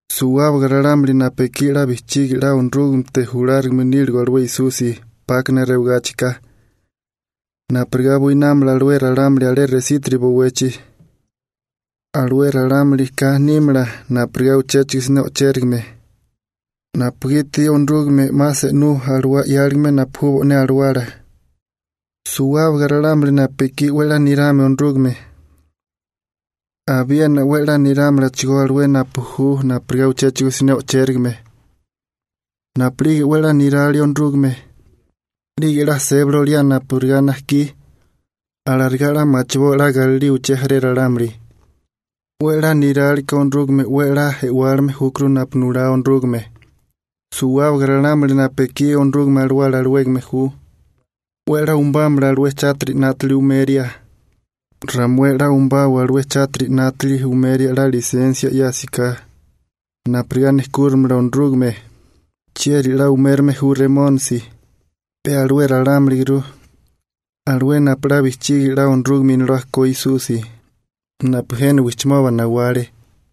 Suwábaga ralámuli napu ekí 'la bijchigi 'la Onorúgamete julárigame níligo alué Esusi 'pákana rewagáchika, napurigá buinámala ralámuli alé resítiri bowechi, alué ralámulika nímala napurigá uchéchigo siné o'chérigame napugiti Onorúgame 'ma se'nú alawá 'yáligame napu ju bo'né alawala. Suwábaga ralámuli napu ekí 'we 'la nirame Onorúgame abiena 'we 'la nerámalachigó alué napu ju napurigá uchéchigo siné o'chérigame. Napu'lige 'we 'la niralia Onorúgame 'lige 'la sébali oliá napurigá najkí, alarigá 'la machiboa 'la galilío uché jaré ralámuli. 'We 'la niráliká Onorúgame 'we 'la e'wálime júkuru napu nulá Onorúgame. Suwábaga ralámuli napu ekí Onorúgame Alawala alawégame ju 'we 'la umubámala alué chátiri 'nátili umeria. Ramué'é 'la umubawa alué chátiri 'nátili umeria 'la lisensia 'yásiká napurigá nejkúrimala Onorúgame. ¿Chieri 'la umérame ju Remónisi? Pe alué ralámuliguru alué napu 'la bijchigi la Onorúgame Inolá ko Esusi napu jena wijchimoba nawale.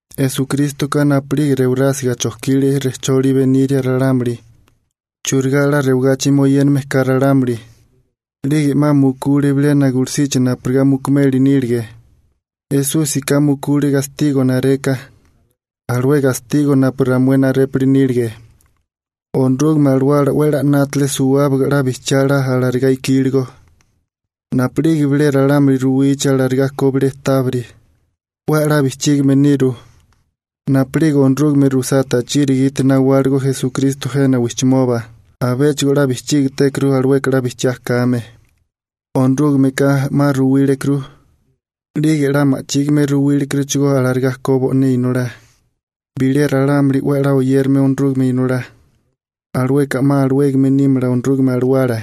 Esukrístoka napu'lige rewarásiga chojkile rejcholi beniria ralámuli churigá 'la rewagachi moyéname ka ralámuli. 'Lige 'ma mukule bilena gulusichi napurigá mukumeli nílige. Esúsika mukule gastigo nareka, alué gastigo napu ramué narépuli nílige. Onorúgame Alawala 'we 'la 'nátale suwábaga 'la bijchiá 'la alarigá ikíligo. Napu'lige bilé ralámuli ruwichi alarigá ko bilé tábiri, 'we 'la bijchígime niru. Napu'lige Onorúgame rusá tachiri gite nawáligo Esukristo jena wijchimoba abéchigo bijchígitékuru alueka 'la bijchiá kame. Onorúgameka 'ma ruwílekuru, 'lige 'la ma'chígime ruwílekuruchigó alarigá ko bo'né Inolá. Bilé ralámuli 'we 'la oyérame Onorúgame Inolá, alueka 'ma alawégame nímala Onorúgame Alawala.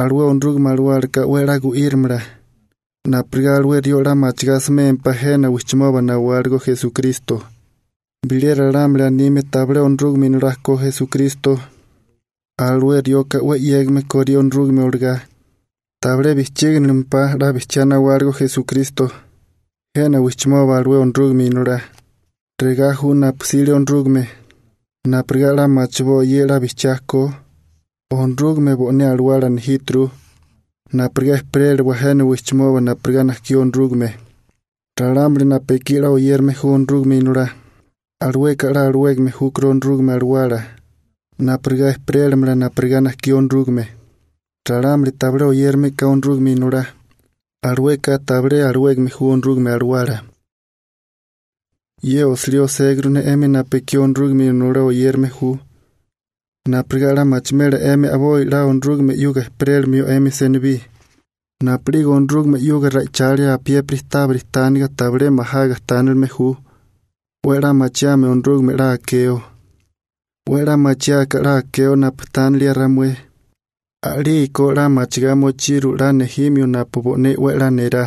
Alué Onorúgame Alawálaka 'we 'la gu'írimala napurigá alué rió 'la machigá asimémpá jena wijchimoba nawáligo Esukristo. Bilé ralámuli anime tabilé Onorúgame Inolá ko Esukristo alué rioka 'we 'yégame korí Onorúgame olagá, tabilé bijchíginilimpá 'la bijchiá nawáligo Esukristo jena wijchimoba alué Onorúgame Inolá. Regá ju napu 'sile Onorúgame napurigá 'la machiboa ye 'la bijchiá ko: Onorúgame bo'né alawala nejíturu napurigá ejperéliwa jena wijchimoba napurigá najkí Onorúgame. Ralámuli napu ekí 'la oyérame ju Onorúgame Inolá, alueka 'la alawégame júkuru Onorúgame Alawala napurigá ejperélamala napurigá najkí Onorúgame. Ralámuli tabilé oyérameka Onorúgame Inolá, alueka tabilé alawégame ju Onorúgame Alawala. Ye osilí oséguru ne 'emi napu ekí Onorúgame Inolá oyérame ju napurigá 'la machimela 'emi a'boi 'la Onorúgame 'yuga ejperélimio 'emi senibí. Napu'lige Onorúgame 'yuga ra'ichalia apiépiri tábiri tánaga tabilé majaga tánilime ju 'we 'la machiame Onorúgame 'la akeo. 'We 'la machiáká 'la akeo napu tánilia ramué a'lígeko 'la machigá mochiru 'la nejimio napu bo'né 'we 'la nerá.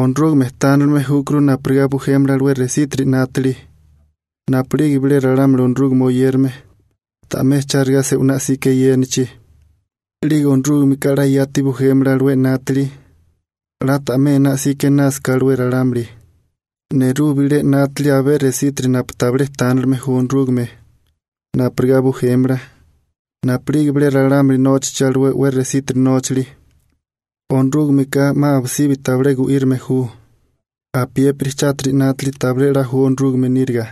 Onorúgame tánilime júkuru napurigá bujémala alué resítiri 'nátili napu'lige bilé ralámuli Onorúgame oyérame ta'mé chárigá se'winá 'sika eyénachi, 'lige Onorúgameka 'la yati bujémala alué 'nátili 'la ta'mé ená 'sika einásaká alué ralámuli. Nerú bilé 'nátili abé resítiri napu tabilé tánilime ju Onorúgame napurigá bujémala. Napu'lige bilé ralámuli nóchachi alué 'we resítiri nóchali, Onorúgameka 'ma abisibi tabilé gu'írame ju. Apiépiri chátiri 'nátili tabilé 'la ju Onorúgame níriga.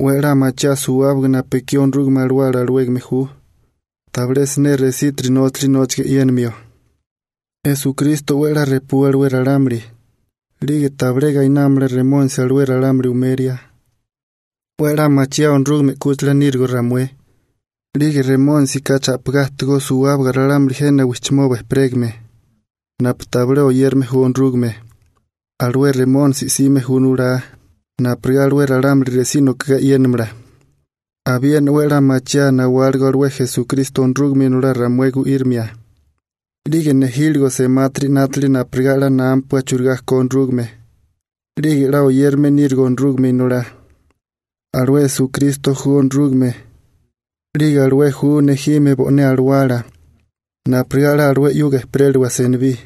'We 'la machiaa suwábaga napu ekí Onorúgame Alawala alawégame ju tabilé siné esítiri nóchali nóchaga e'yénimio. Esukristo 'we 'la repú alué ralámuli, 'lige tabilé gainámala Remónisi alué ralámuli umeria. 'We 'la machiaa Onorúgame 'kúchila nírigo ramué, 'lige Remónisika cha'pigá ajtigó suwábaga ralámuli jena wijchimoba ejperégame napu tabilé oyérame ju Onorúgame. Alué Remónisi 'sime ju nulá napurigá alué ralámuli resí nokagá e'yénamala. Abiena 'we 'la machiaa nawáligo alué Esukristo Onorúgame Inolá ramué gu'írimia, 'lige nejíligo semátiri 'nátili napurigá 'la námapua churigá ko Onorúgame 'lige 'la oyérame nírigo Onorúgame Inolá. Alué Esukristo ju Onorúgame 'lige alué ju nejime bo'né Alawala napurigá 'la alué 'yuga ejperéliwa senibí.